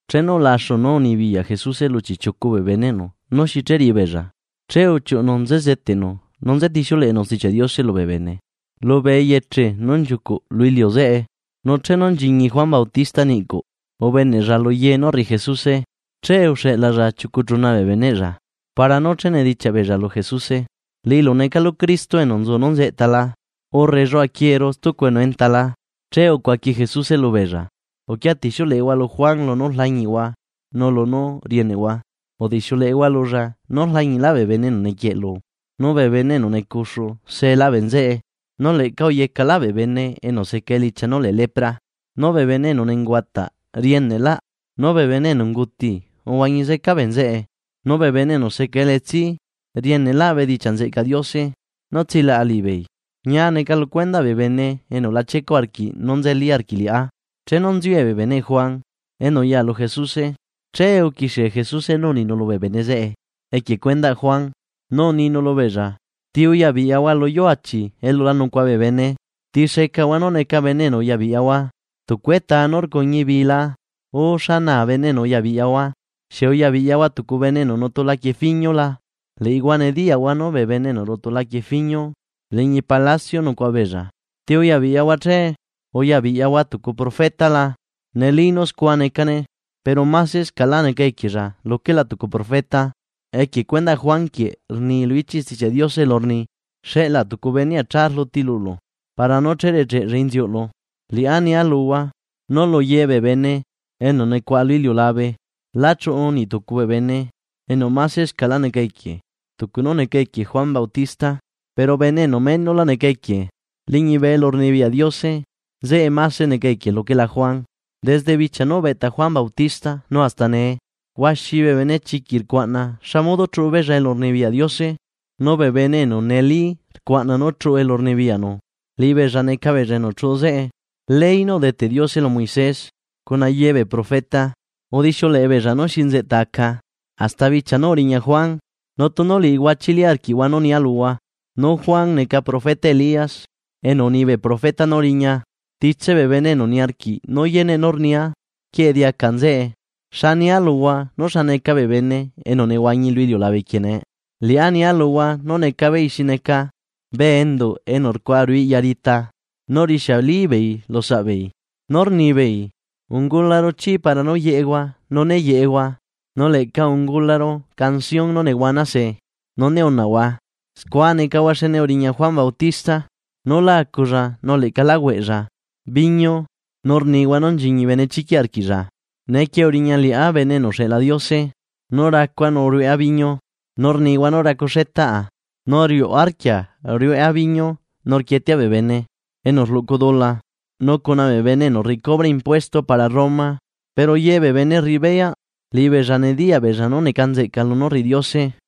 Chenu ulaxu nú unibiyaꞌ Jesuse lu chiꞌchiucu bee beneꞌnu nú xi che riꞌi beella, che uchiuꞌunu nze zeteꞌnu nu nze tixiuleꞌenu Stichiaꞌ Diose lubee bene lubee eyeche nú nchiucuꞌ lu iliu zeꞌe. Nu chenu nchiñi Juan Bautista niꞌcuꞌ ubeneꞌlla luye nú rriꞌi Jesuse. Che uxeꞌlalla chiucu chuna bee beneꞌlla, para nú che nedichiaꞌ beella lu Jesuse: ―¿Liꞌilu necalu Cristo enu nzu nú nzeꞌta la, urre lluaquieeru stucu enu enta la? Che ucuaqui Jesuse lubeella: ―Uquia tixiuleꞌehua lu Juan Bautista lunú rlañiꞌhua nu lunú rieneꞌhua. Udixiuleꞌehua lulla nú rlañiꞌlaꞌ bee bene enu nequieꞌlu nu bee bene enu necuxu see la bee nzeꞌe, nu leꞌca uyecaꞌlaꞌ bee bene enu seca elichia nú lee lepra, nu bee bene enu nenguataꞌ rieneꞌlaꞌ, nu bee bene enu unguti uhuañi zeca bee nzeꞌe, nu bee bene enu seca elitsi rieneꞌlaꞌ bedichiaꞌ nzeꞌcaꞌ Diose nú tsilaꞌa liꞌibeei. Ñia neca lu cuendaꞌ bee bene enu la chiecuꞌ arquiꞌ nú nzeli arquiꞌ liꞌá. Chenu nziue bee beneꞌ Juan enu uya lu Jesuse, che uquixie Jesuse nú uninu lubee bene zeꞌe equie cuendaꞌ Juan, nu uninu lubeella: ―¿Ti uya biꞌyahua lu yuu achi elu la nucuaꞌa bee bene? ¿Ti secahua nú neca bene enu uya biꞌyahua, tucu etaa nú rcuñi bii la? Urre ¿xa naa bene enu uya biꞌyahua? ¿Xieꞌ uya biꞌyahua tucu bene enu nutu laquie fiñu la? Liꞌihua nediyaꞌhua nú bee bene enu rutu laquie fiñu liñi palacio nucuaꞌa beella. ¿Ti uya biꞌyahua che? ¿Uya biꞌyahua tucu profeta la? Neli nú scua necane, pero masescaꞌlá neca equiella luquela tucu profeta. Equie cuendaꞌ Juan quieꞌ rni lu ichiꞌ Stichiaꞌ Diose elu rni: Xeꞌlaa tucu benea cha rluti lulu, para nú recheꞌlla inziuꞌlu. Liꞌá nia luhua nu luye bee bene enu nucuaꞌa lu iliulabe lá chuꞌu niꞌ tucu bee bene enu masescaꞌlá neca equie tucu nú neca equie Juan Bautista. Pero bene enu menola neca equie liñibe elurnibiyaꞌ Diose nzeꞌe mase neca equie luquela Juan. ’Desde bichia nú ubeꞌta Juan Bautista nu hasta nee, huaxi bee benechiquiꞌ rcuaꞌna xa modo chuꞌu elurnibiyaꞌ Diose. Nu bee bene enu neli rcuaꞌna nú chuꞌu elu rnibiyaꞌnu, liꞌibeella neca beella enu chuꞌu zeꞌe. Ley nú udeteꞌ Diose lu Moisés cuna yebee profeta udixiuleꞌe beella nú xi nzeꞌta aca, hasta bichia nu uriña Juan, nu tunu liꞌihua chili arquiꞌhua nú nia luhua, nú Juan neca profeta Elías enu uni bee profeta nú riña. Titse bee bene enu niarquiꞌ nú yeneꞌ nú rnia, quieꞌe diaca nzeꞌe. ’¿Xa nia luhua nú xa neca bee bene enu nehuañi lu iliulabe quieꞌ nee? Liꞌá nia luhua nú neca beei xi neca bee enduꞌ enu rcuaꞌa ruꞌu iꞌya rita nu rixiali beei lusaꞌ beei, nú rnibeei: “Ungularu chí para nú yeꞌehua nu né yeꞌehua, nu leꞌca ungularu canción nú nehuana se, nu né unaꞌhua.” Scua necahua xne uriña Juan Bautista nú lá aculla nu leꞌca la hueꞌlla viñu nu rnihua nú nchiñi benechiquiꞌ arquiꞌlla. Neequie uriña liꞌá Bene enu uxeꞌla Diose, nú racua nu rueꞌa biñu, nu rnihua nú racuxetaꞌa nu riuꞌ arquia rueꞌa viñu nu rquietea bee bene enu rluꞌcu dula nu cuna bee bene enu rriꞌi cubre impuesto para Roma. Pero yebee bene rriꞌi beyaꞌ, liꞌibeella nediyaꞌ beella nú neca nzeꞌca lunú rriꞌi Diose.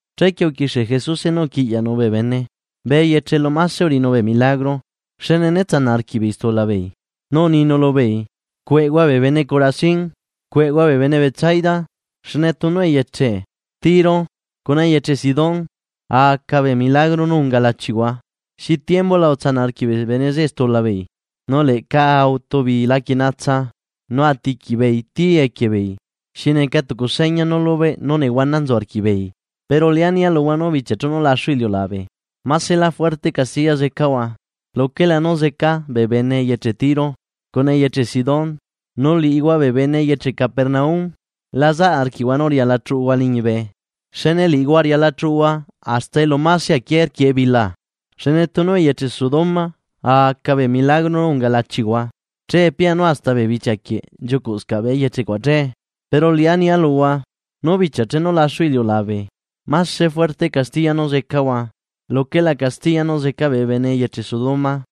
Chequie uquixie Jesuse nú uquiꞌyaꞌnu bee bene bee eyeche elu mase uriꞌinu bee milagro, xne né tsanaꞌ arquiꞌbeei stula beei. Nu uninu lubeei: ―¡Cueꞌhua bee bene Corazín! ¡Cueꞌhua bee bene Betsaida! Xne tunu eyeche Tiro cuna eyeche Sidón a aca bee milagro nú unga lachihua, xi tiembula a tsanaꞌ arquiꞌ bee bene zeꞌe stula beei, nu leꞌca a utu beei laquie natsa nu a tiqui beei tii equie beei, xi neca tucu seña nú lubeꞌ nú nehuana nzu arquiꞌbeei. Pero liꞌá nia luhua nú bichia chenu laxu iliulabe, maselá juerte castiya zecahua luquela nú zeca bee bene eyeche Tiro cuna eyeche Sidón. Nu liꞌihua bee bene eyeche Capernaum, ¿la zaꞌ arquiꞌhua nú riala chuꞌuhua liñibe? ¡Xne liꞌihua riala chuꞌuhua hasta elu mase aquié rquiꞌ ebila! Xne tunu eyeche Sodoma a aca bee milagro nú unga lachihua, che pianu hasta bee bichia quieꞌ nchiucuꞌscaꞌ bee eyeche cuaꞌ che. Pero liꞌá nia luhua nú bichia chenu laxu iliulabe mase juerte castiya nú zecahua luquela castiya nú zeca bee bene eyeche Sodoma.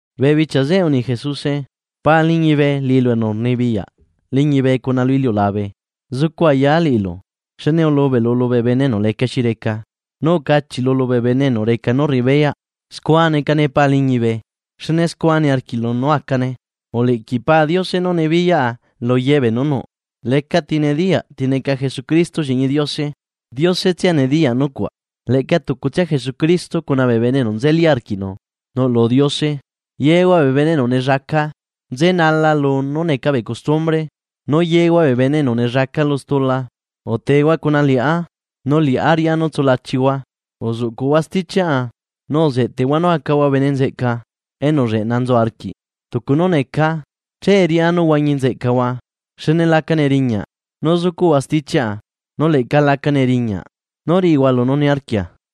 Bee bichia zeꞌe uni Jesuse: “Pa liñibe liꞌilu enu rnibiyaꞌ liñibe cuna lu iliulabe, zucu ayaa liꞌilu xne ulubeꞌlu lubee bene enu lecaxi reca, nu ucachiꞌlu lubee bene enu reca nu rriꞌi beyaꞌ. Scua necane Pa liñibe, xne scua niarquiꞌlu nú acane. ’Uliquiꞌ Pa Diose nú nibiyaꞌa luye beenú nuꞌ. Lecati nediyaꞌ ti neca Jesucristo lliꞌñi Diose, Diose tsia nediyaꞌ nucuaꞌ, leꞌca tucutsia Jesucristo cuna bee bene enu nzeli arquiꞌ liꞌinu nuꞌlu Diose. Yehua bee bene enu nellaca nzenala lunú neca bee custumbre, nu yehua bee bene enu nellaca lu stula, utehua cuna liꞌá nu liꞌá riꞌá nú tsulachihua. Uzuꞌcuꞌhua stichiaꞌa, nu zeꞌtehua nú acahua bene nzeꞌca enu lleꞌna nzu arquiꞌ tucu nú necaa. Che riꞌá nú huañi nzeꞌcahua. Xne laca neriñaꞌ nú zucuꞌhua stichiaꞌa nu leꞌca laca neriñaꞌ nú riꞌihua lunú niarquia.